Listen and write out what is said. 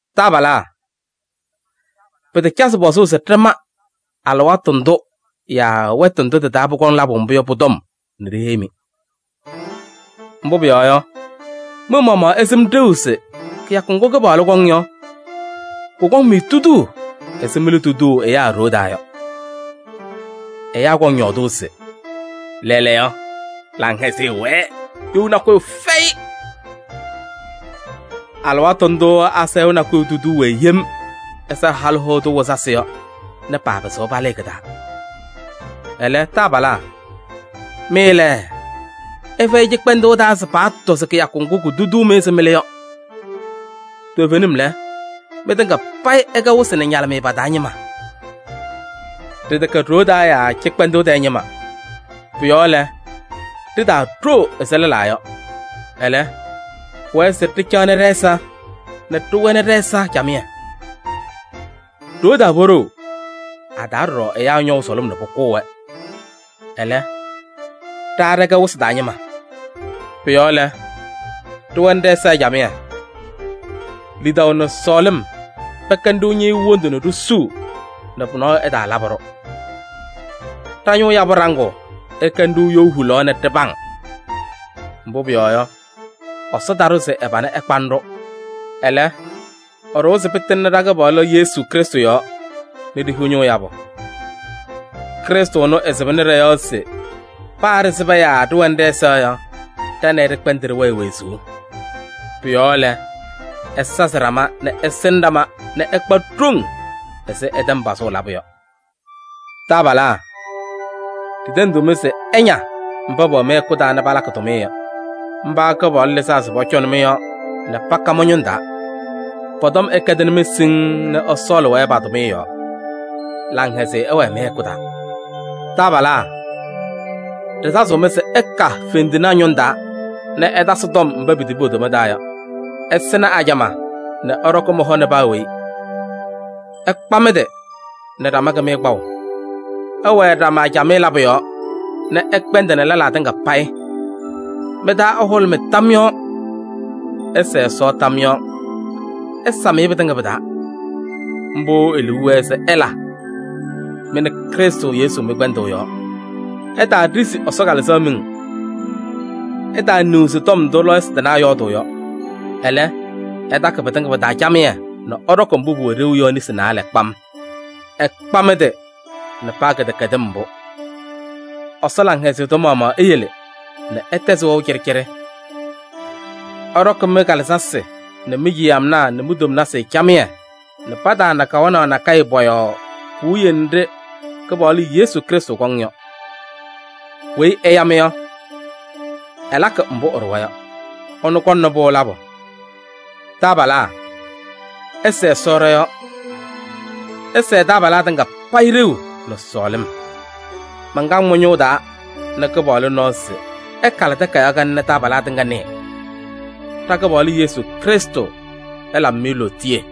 Taabalaa! Pɩtacazɩ pɔzʋʋ se ɖɩma alɩwaatʋ ndʋ yaa wɛtʋ ndʋ tɩ-taa pʋkɔŋ labʋ mbʋ yɔ, pʋ-tɔm nɛ ɖiheyi-mɩ. Mbʋ pʋyɔɔ yɔ, mɩ-maɣmaɣ ɩsɩm ɖeu se kɩyakʋ ŋgʋ Kɩpaɣlʋ kɔŋ yɔ, kʋkɔŋ-mɩ tuduu ɛzɩ mɩlʋ tuduu ɛyaa ɖoo taa yɔ. Ɛyaa kɔŋ yɔɔdʋʋ se: “Lɛɛlɛɛyɔ, laŋhɛzɩyɛ wɛɛ, you nakʋyʋ fɛyɩ!” Alɩwaatʋ ndʋʋ asayʋʋ nakʋyʋ tuduu-wɛ yem ɛzɩ halʋ hoa tʋ wɩzasɩ yɔ nɛ paapɩzɩɣ palɩɩ kɩ-taa. Ɛlɛ, taabalaa! Mɩ lɛ, ɩfɛyɩ cɩkpɛndʋʋ taa se paatɔ se kɩyakʋ ŋgʋ kutuduu-mɩ ɛzɩ mɩlʋ yɔ. Toovenim lɛ, mɩtɩŋa payɩ ɩkɛ wɩsɩ nɛ ñalɩmɩyɛ pa-taa ñɩma. Ɖɩtɛkɛ ɖoo taa yaa cɩkpɛndʋʋ tɛɛ ñɩma. Pʋ-yɔɔ lɛ, ɖitaaɖoo ɛzɩ lɛlaa yɔ. Ɛlɛ, pʋwɛɛ se ɖɩcaɣ ɖɛ-ɛza yɔɔ nɛ ɖɩwɛnɩ ɖɛ-ɛza camɩyɛ. Ɖoo taa poɖou, a-taa ɖɔɖɔ ɛyaa ñɔʋ sʋlʋm nɛ pʋkʋʋ-wɛ. Ɛlɛ, ɖa ɖɛkɛ wɩsɩ taa ñɩma. Pʋ-yɔɔ lɛ, ɖɩwɛnɩ ɖɛ-ɛza camɩyɛ. Lidaʋ nɛ sɔɔlɩm pɛkɛnɩ-ɖʋ ñɩɣyʋʋ wondu nɛ ɖisuu nɛ pʋyʋ nɔɔyʋ ɛtaalabɩ-ɖʋ. Ɖa-ñʋʋ yabʋ ɖaŋʋʋ ɛkɛnɩ-ɖʋ you hulaɣ nɛ ɖɩpaŋ. Mbʋ pʋyɔɔ yɔ, Ɛsɔ taɖʋ se ɛ-pana ɛkpanɩ-ɖʋ, ɛlɛ, ɛɖʋwa se pɩtɩŋnɩ ɖa-Kɩpaɣlʋ Yesu Krɩstʋ yɔɔ nɛ ɖihiɣ ñʋʋ yabʋ. Krɩstʋ ɛnʋ ɛsɩbɩnɩ ɖɔ-yɔɔ se paa ɖɩsɩba yaa ɖɩwɛnɩ ɖɛ-ɛza yɔ, ɖa nɛ ɩ ɖɩkpɛndɩ ɖɩwɛɛ wezuu. Pʋ-yɔɔ lɛ, ɩsazɩ ɖama nɛ ɩsɩnɩ ɖama nɛ ɩkpa ɖoŋ ɛzɩ ɩtɛm pazʋʋ labʋ yɔ. Taabalaa! Ɖitendiɣ-mɩ se ɩña mba pɛwɛ mɩ-hɛkʋ taa nɛ palakɩ tʋmɩyɛ yɔ. Mba Kɩpaɣlʋ lɩzaa se pɔcɔnɩ mɩ-yɔɔ nɛ paka mɩ-ñʋŋ taa. Pɔ-tɔm ɛkɛdɩnɩ-mɩ siŋŋ nɛ ɩsɔɔlɩ-wɛ pa-tʋmɩyɛ yɔɔ. Laŋhɛzɩyɛ ɛwɛɛ mɩ-hɛkʋ taa. Taabalaa! Ɖɩsazɩɣ-mɩ se ɩka fendinaa ñʋŋ taa nɛ ɩtasɩ tɔm mba pitibi po-toma taa yɔ. Ɩsɩnɩ ajamaa nɛ ɩɖɔkɩ mɩ-hɔ nɛ paa weyi. Ɩkpa mɩ-tɩ nɛ ɖama kɩmɩyɛ kpaʋ. Ɩwɛɛ ɖama camɩyɛ labʋ yɔɔ nɛ ɩkpɛndɩnɩ lɛlaa tɩŋa payɩ. Mɩ-taa ɛhʋlʋmɩ tam yɔɔ. Ɩsɛɛ Ɛsɔ tam yɔɔ. Ɩsam-ɩ pɩtɩŋa pɩ-taa, mbʋ e-liu wɛɛ se ɩla mɩ nɛ Krɩstʋ Yesu mɩ-kpɛndʋʋ yɔɔ. Ɩtaaɖizi Ɛsɔ Kalɩzaɣ miŋ. Ɩtaaniɣzi tɔm ndʋ lɔɔyɩsɩ tɩnaa yɔɔdʋʋ yɔ. Ɛlɛ, ɩtakɩ pɩtɩŋa pɩ-taa camɩyɛ nɛ ɩɖɔkɩ mbʋ pʋwɛ ɖeu yɔ nesi naalɛ. Ɩkpa mɩ-tɩ nɛ paa kɩdɛkɛdɩm mbʋ. Ɛsɔ laŋhɛzɩyɛ tʋ maɣmaɣ eyele nɛ ɩtɛzɩ wɛʋ cɩɖɩcɩɖɩ. Ɛɖɔkɩ mɩ-kalɩzasɩ nɛ mi-ciyamnaa nɛ mi-tomnasɩ camɩyɛ nɛ pataana kawanaɣ nakɛyɛ pɔ-yɔɔ puwiye nɖɩ Kɩpaɣlʋ Yesu Krɩstʋ kɔŋ yɔ. Weyi ɛya-mɩ yɔ, ɛlakɩ mbʋ ɛɖʋwa yɔ: ɛnʋ kɔŋnɩ-pʋ labʋ. Taabalaa! Ɩsɛɛ Ɛsɔ ɖɔ-yɔɔ. Ɩsɛɛ taabalaa tɩŋa payɩ ɖeu nɛ sɔɔlɩm. Mankaŋ mɩ-ñʋʋ taa nɛ Kɩpaɣlʋ nɔɔ se ɩkalɩ takayaɣ kanɛ nɛ taabalaa tɩŋa nɩɩ. Ɖa-Kɩpaɣlʋ Yesu Krɩstʋ ɛlabɩ-mɩ lootiye!